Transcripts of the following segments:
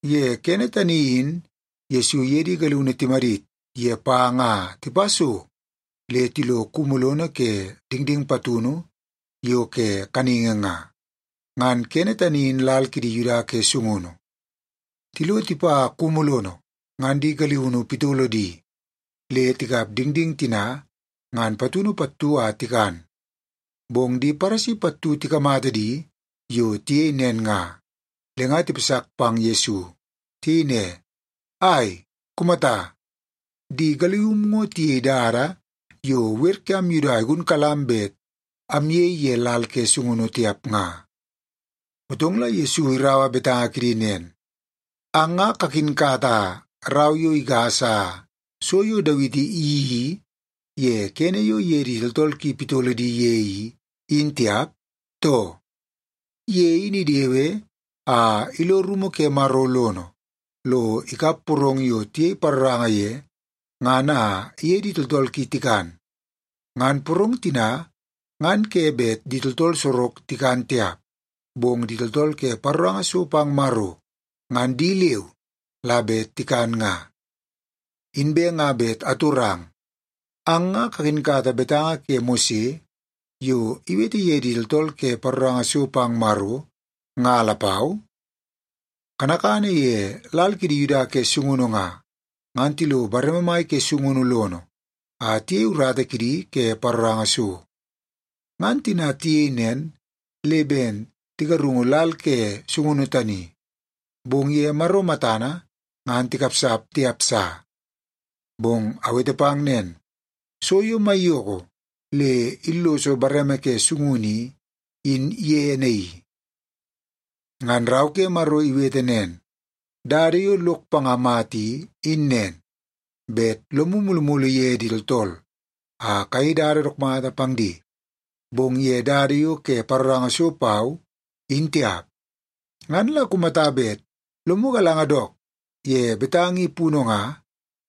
Ye kene tani in Yesu iye di galiunu timadit ye panga a tipa so le tilo kumu lono ke dingding patunu yo ke kaningi nga, ngan kene tani in lal kidi Yuda ke sungunu. Tilo tipa kumu lono, ngan di galiunu pitolo di le tikap dingding tina ngan patunu pattu a tikan. Bong di Paresi pattu tikamata di yo tiyei nen nga, le nga tipasak pang Yesu. Tiyei ne, “Ai, kumata! Di galium ngo tiyei dada yo wer kiam Yuda igunkalam bet amyei ye lal ke sungunu tiap nga.” Motong la Yesu iraua betanga kidi nen, “Ang nga kakinkata rau yo igasa so yo Dawiti iyeii ye kene yo iye di tooltool ki pitolo di ye i, in tiap, too? Ye in idewe a ilo rumu ke Maro lono, lo ikap porong yo tiyei paroranga ye ngan a iye di tooltool ki tikan. Ngan porong tina ngan ke bet di tooltool sorok tikan tiap, bong di tooltool ke paroranga so pang Maro, ngan di leu la bet tikan nga. Inbe nga bet atorang, ang nga kakinkata betanga ke Mose yo iwete ye di tooltool ke paroranga so pang Maro, nga lapau? Kanakana ye lal kidi Yuda ke sungunu nga, ngan tilo bareme mai ke sungunu lono a tiyei urata kidi ke paroranga so. Ngan tina tiyei nen, le ben tigarungu lal ke sungunu tani, bong ye Maro matana ngan tikapsap tiap sa. Bong awete pang nen, so yo maiyoko le illoso bareme ke sungunu i, in ye naii. Ngan Rau ke Maro iwete nen, ‘Dada yo lok panga mata i, in nen, bet lomu mulumulu ye di tooltool a kayei dada dook mata pang di, bong ye dada yo ke paroranga so pau, in tiap.’ Ngan la kumata bet lomu galanga dook ye betanga i punu nga,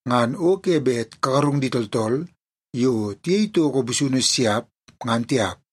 ngan o ke bet kagarung di tooltool yo tiyei toko busunu siap, ngan tiap.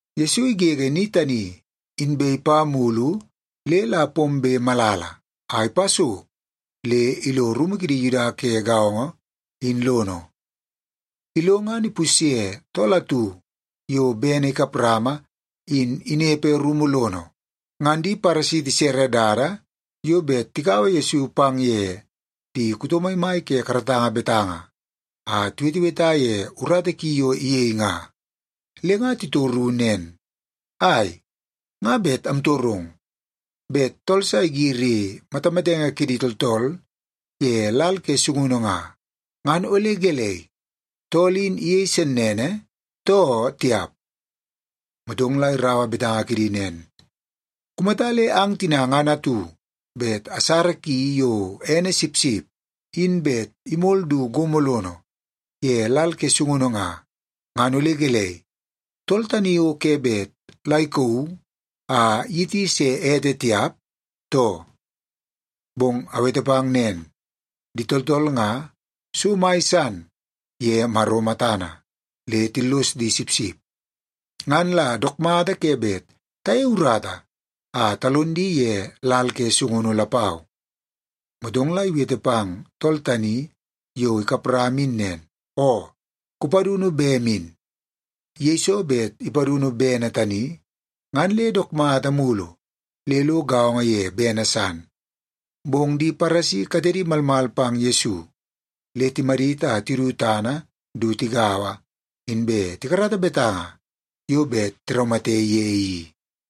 Yesu igege ni tani, inbe ipa mulu le la pombe malala, a ipa so le ilo rumu kidi Yuda ke gaongo, in lono. Ilo ngan ipusye tool atu yo bene ikap rama in inepe rumu lono. Ngan di Paresi tisere dada yo bet tikaua Yesu pang ye di kuto maimai ke karatanga betanga a tiweteweta ye urata ki yo iyei nga. Le nga titoru nen, “Ai, nga bet amtorong. Bet tool sa igiri matamatenge kidi tooltool ye lal ke sungunu nga, ngan ole gelei, tool in iyei sennene, too tiap?” Motong la iraua betanga kidi nen, “Kumata le ang tina ngan atu bet asara ki yo ene sipsip in bet imol du gomo lono ye lal ke sungunu nga, ngan ole gelei, tool tani o ke bet la ikauu a iyiti se ete tiap, too? Bong awete pang nen, di tooltool nga so mai san ye Maro matana, le tillos di sipsip. Ngan la dook mata ke bet tayei urata a talon di ye lal ke sungunu lapau.” Motong la iwete pang tool tani yo ikap rama in nen, “Oo, kupadunu bem in.” Yeiso bet ipadunu bene tani, ngan le dook mata mulu le lo gaongo ye bene san. Bong di Paresi katedi malmal pang Yesu, le timadit a tidu tana du tigaua, inbe tikarata betanga yo bet tiraumate ye i.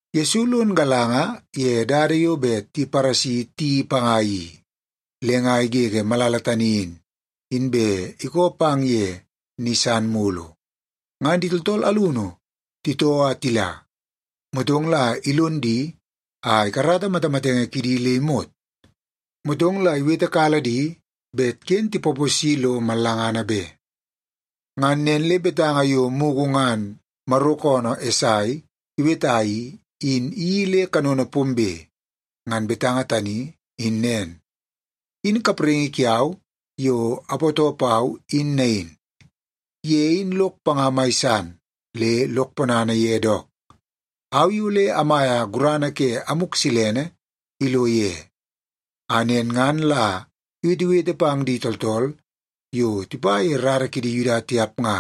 Yesu lon galanga ye dada yo bet di Paresi tiyeii panga i, le nga igege malala tani in, inbe ikoo pang ye ni san mulu. Ngan di tooltool alunu titoo a tila, motong la ilon di a ikarata matamatenge kidi le imot. Motong la iwetekala di bet ken tipaposi lo mallangana be. Ngan nen le betanga yo mugu ngan Maro koonoo Esai iweta i, in iyeii le kanono pombe. Ngan betanga tani in nen, “In kapraingi kiau yo apootoo pau in nain. Ye in lok panga mai san, le lok ponana ye dook. Au i ole amaia gurana ke Amuk Silene ilo ye, a nen ngan la iwetewete pang di tooltool yo tipa ye rara kidi Yuda tiap nga,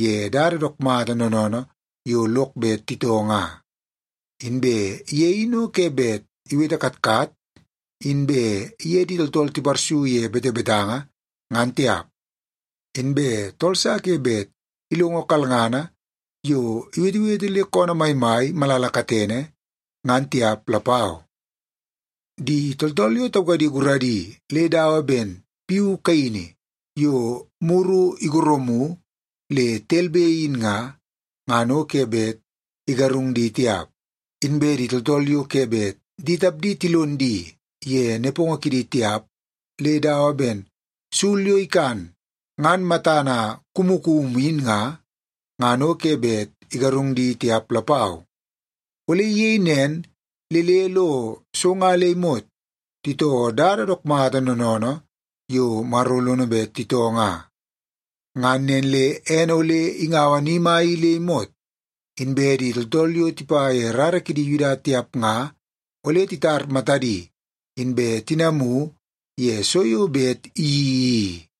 ye dada dook mata noonoonoo yo lok bet titoo nga. Inbe ye in o ke bet iwete katkat, inbe iye di tooltool tiparsu ye betebetanga, ngan tiap. Inbe tool sa ke bet ilongo kalngana yo iwetewete le koonoo maimai malala katene, ngan tiap lapau. Di tooltool yo taukadi guradi le dawa ben piu kaini yo muru igorumu le telbe in nga, ngan o ke bet igarung di tiap. Inbe di tooltool yo ke bet di tapdi tilon di ye nepongo kidi tiap, le dawa ben sul yo ikan ngan matana kumukumu in nga, ngan o ke bet igarung di tiap lapau. Ole iyei nen le le lo so nga le imot titoo dada dook mata noonoonoo yo Maro lono bet titoo nga. Ngan nen le ene ole ingaua ni mai i le imot, inbe di tooltool yo tipa ye rara kidi Yuda tiap nga ole titar matadi, inbe tinamu ye so yo bet iyeii i.”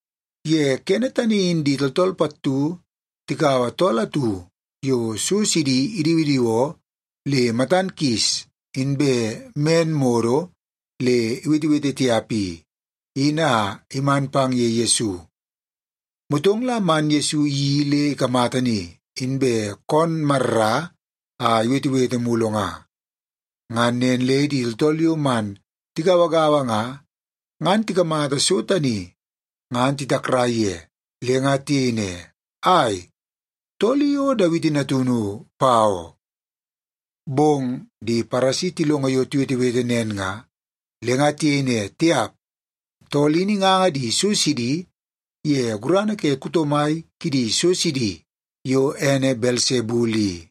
Ye kene tani in di tooltool pattu tikaua tool atu yo so sidi idiwidiwoo le matan kis inbe men modo le iwetewete tiap i, in a iman pang ye Yesu. Motong la man Yesu iyeii le ikamata ni, inbe koon marra a iwetewete mulu nga. Ngan nen le di tooltool yo man tigauagaua nga, ngan tikamata so tani ngan titakrai ye. Le nga tiyei ne, “Ai, tool i o Dawiti Natunu, pa oo?” Bong di Paresi tilongo yo tiwetewete nen nga, le nga tiyei ne, “Tiap, tool in inganga di so sidi ye gurana ke kuto mai kidi so sidi yo ene Belsebul i.”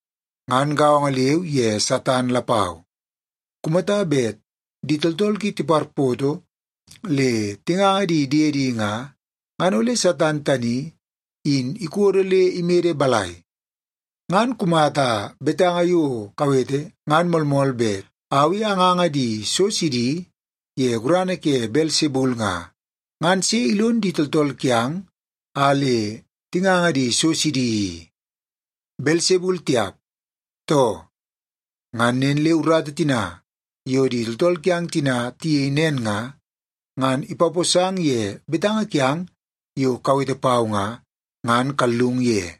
Ngan gaongo leu ye Satan lapau. Kumata bet di tooltool ki tiparpoto le tinganga di diedi nga, ngan ole Satan tani in ikodo le imede balai? Ngan kumata betanga yo kawete ngan moolmool bet au i anganga di so sidi ye gurana ke Belsebul nga, ngan sei ilon di tooltool kiang a le tinganga di so sidi i? Belsebul tiap, too? Ngan nen le urata tina yo di tooltool kiang tina tiyei nen nga, ngan ipaposang ye betanga kiang yo kawete pau nga, ngan kallung ye.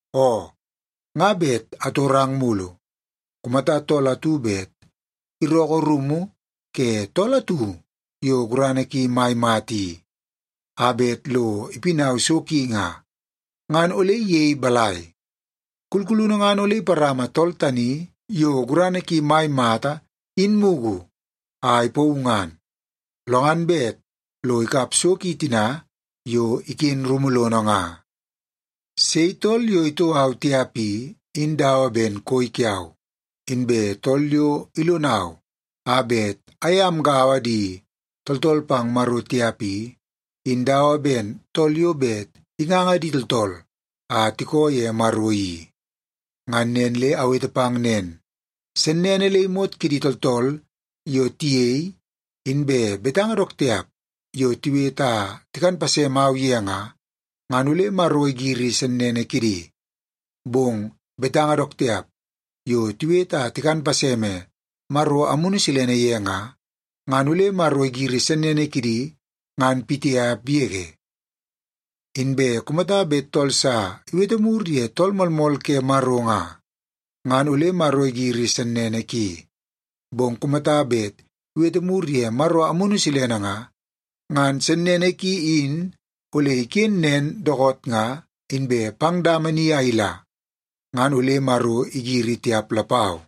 “Oo, nga bet atorang mulu. Kumata tool atu bet irookoo rumu ke tool atu yo gurana ki mai mata i a bet lo ipinau so ki nga, ngan ole iyei balai? Kulkulunu ngan ole iparama tool tani yo gurana ki mai mata in mugu a ipauu ngan, lo ngan bet lo ikap so ki tina yo iken rumu lono nga. “Sei tool yo itoo au tiap i, in dawa ben koi kiau. Inbe tool yo ilonau a bet aye amgaua di tooltool pang Maro tiap i, in dawa ben tool yo bet inganga di tooltool a tikoo ye Maro i. Ngan nen le awete pang nen, sennene le imot kidi tooltool yo tiyei, inbe betanga dook tiap yo tiwete a tikan pasemau ye nga, ngan ole Maro igiri sennene kidi. Bong betanga dook tiap yo tiwete a tikan paseme Maro Amunu Silene ye nga, ngan ole Maro igiri sennene kidi ngan pitiap yege. Inbe kumata bet tool sa iwete mur ye Tool Moolmool ke Maro nga, ngan ole Maro igiri sennene ki. Bong kumata bet iwete mur ye Maro Amunu Silene nga, ngan sennene ki in ole iken nen dookoot nga, inbe pang dama ni a ila, ngan ole Maro igiri tiap lapau.”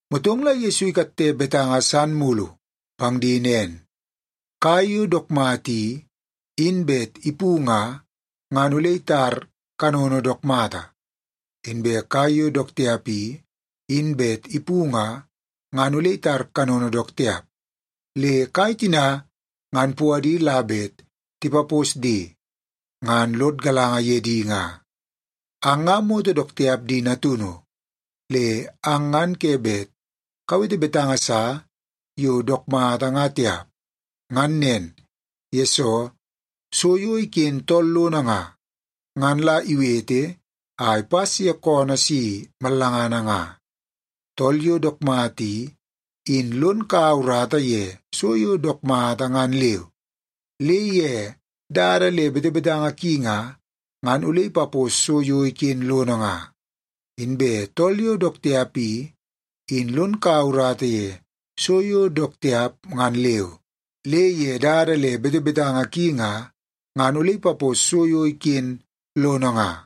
Motong la Yesu ikatte betanga san mulu pang di nen, “Kai yo dook mata i, in bet ipu nga, ngan ole itar kanono dook mata. Inbe kai yo dook tiap i, in bet ipu nga, ngan ole itar kanono dook tiap. Le kai tina ngan puadi la bet tipapos di, ngan lod galanga ye di nga. Ang nga moto dook tiap di natunu! Le ang ngan ke bet kawete betanga sa yo dook mata nga tiap. Ngan nen, yesoo so yo iken tool lono nga, ngan la iwete a ipas ye koonoo si mallangana nga. Tool yo dook mata i, in lon kaua urata ye so yo dook mata ngan leu, le ye dada le betebetanga ki nga, ngan ole ipapos so yo iken lono nga. Inbe tool yo dook tiap i, in lon kaua urata ye so yo dook tiap ngan leu, le ye dada le betebetanga ki nga, ngan ole ipapos so yo iken lono nga.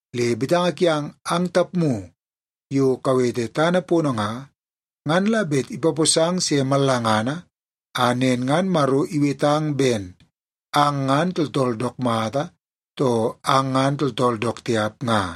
Le betanga kiang ang tapmu yo kawete tana pono nga, ngan la bet ipaposang se mallangana a nen ngan Maro iwetang ben ang ngan tooltool dook mata, too ang ngan tooltool dook tiap nga.”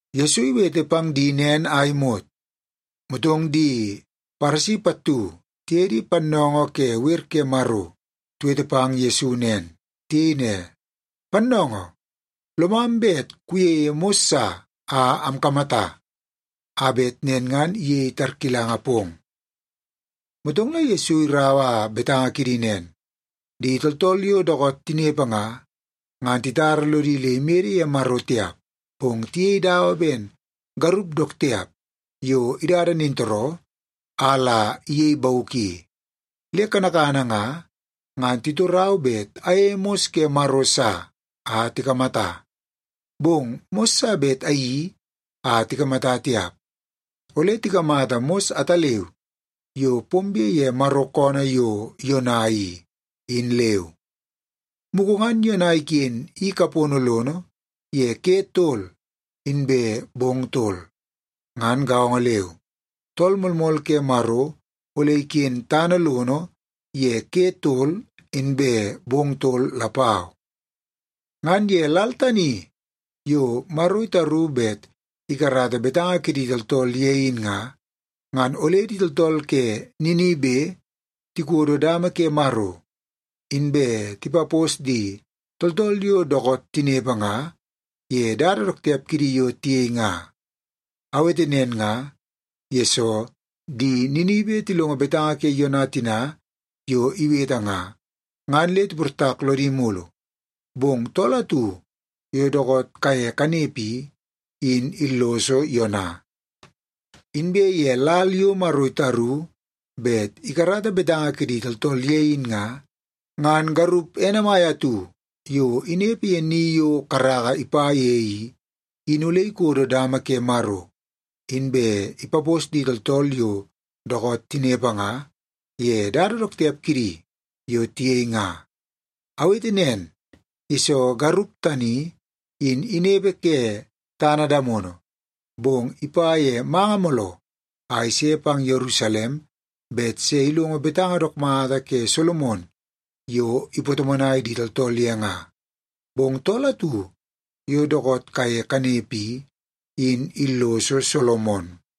Yesu iwete pang di nen a imot, motong di Paresi pattu tiye di pannoongoo ke wer ke Maro tiwete pang Yesu nen. Tiyei ne, “Pannoongoo, lomam bet kuyeie mos sa a amkamata, a bet nen ngan iyei tarkilanga pong.” Motong la Yesu iraua betanga kidi nen, “Di tooltool yo dookoot tinepe nga, ngan titara lodi le imede ye Maro tiap, bong tiyei dawa ben garup dook tiap yo idada nintooroo a la iyei bauk i. Le kanakana nga, ngan titorau bet ayeie mos ke Maro sa a tikamata. Bong mos sa bet ayeii a tikamata tiap. Ole tikamata mos ataleu yo pombe ye Maro koonoo yo Yona i, in leu. Mugu ngan Yona iken i kapono lono ye ke tol inbe bong tol. Ngan gaongo leu, Tool Moolmool ke Maro ole iken tana lono ye ke tol inbe bong tol lapau. Ngan ye lal tani yo Maro itaru bet ikarata betanga kidi tooltool ye in nga, ngan ole di tooltool ke Ninibe tikodo dama ke Maro, inbe tipapos di tooltool yo dookoot tinepe nga, ye dada dook tiap kidi yo tiyei nga. Awete nen nga, yesoo di Ninibe tilongo betanga ke Yona tina yo iwete nga, ngan le tiportak lodi mulu. Bong Tool atu yo dookoot kaye kanepe i, in illoso Yona. Inbe ye lal yo Maro itaru bet ikarata betanga kidi tooltool ye in nga, ngan garup ene mai atu yo inepe ye ni yo karaka ipa ye i, in ole ikodo dama ke Maro, inbe ipapos di tooltool yo dookoot tinepe nga, ye dada dook tiap kidi yo tiyei nga. Awete nen, yesoo garup tani, in inepe ke tana damono, bong ipa ye manga mooloo a ise pang Yerusalem bet se ilongo betanga dook mata ke Solomon yo ipatomonai di tooltool ye nga. Bong Tool atu yo dookoot kaye kanepe i, in illoso Solomon.”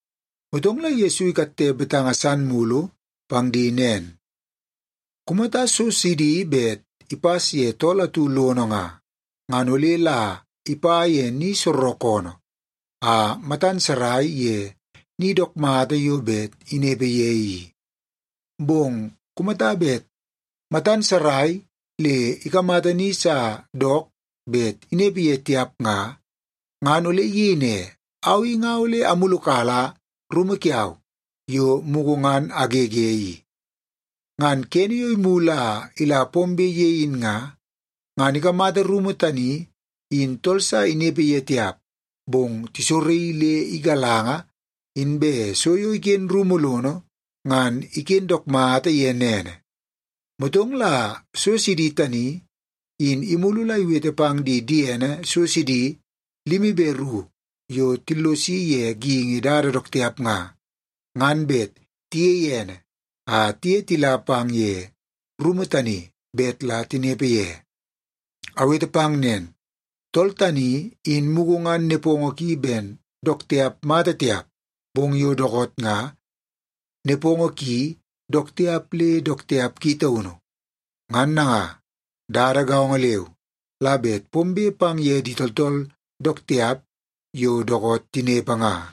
Motong la Yesu ikatte betanga san mulu pang di nen, “Kumata so sidi bet ipas ye tool atu lono nga, ngan ole la ipa ye ni soorookoonoo a matan sarai ye ni dook mata yo bet inepe ye i. Bong kumata bet matan sarai le ikamata ni sa dook bet inepe ye tiap nga, ngan ole iyei ne, ‘Au i nga ole amulukala rumu kiau yo mugu ngan agege i.’ Ngan kene yo imulu a ila pombe ye in nga, ngan ikamata rumu tani in tool sa inepe ye tiap, bong tisoraii le igalanga, inbe so yo iken rumu lono ngan iken dook mata ye nene. Motong la so sidi tani in imulu la iwete pang di diene so sidi limi be ru yo tillosi ye geingi dada dook tiap nga, ngan bet tiyei ene a tiye tila pang ye rumu tani bet la tinepe ye. Awete pang nen, tool tani in mugu ngan nepongo ki ben dook tiap mata tiap, bong yo dookoot nga nepongo ki dook tiap le dook tiap ki taunu. Ngan nanga, dada gaongo leu la bet pombe pang ye di tooltool dook tiap yo dookoot tinepe nga.”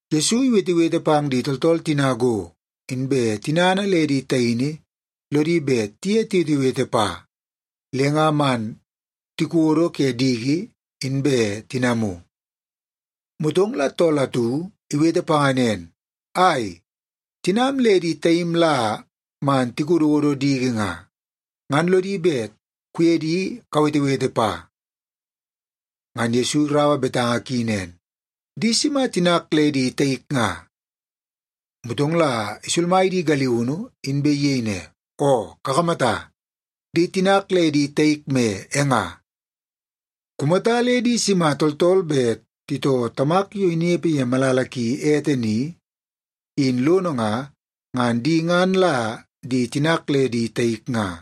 Yesu iwetewete pang di tooltool tina go, inbe tinana le di taini lodi bet tiye tiwetewete pa, le nga man tikodo ke diki, inbe tinamu. Motong la tool atu iwete panga nen, “Ai, tinam le di taim la man tikododo diki nga, ngan lodi bet kuye di kawetewete pa.” Ngan Yesu iraua betanga ki nen, “Di sima tinak le di taik nga?” Motong la isulmai di galiunu, inbe iyei ne, “Oo, kakamata, di tinak le di taik me e nga. Kumata le di sima tooltool bet titoo Tamak yo inepe ye malala ki ete ni i, in lono nga, ngan di ngan la di tinak le di taik nga.”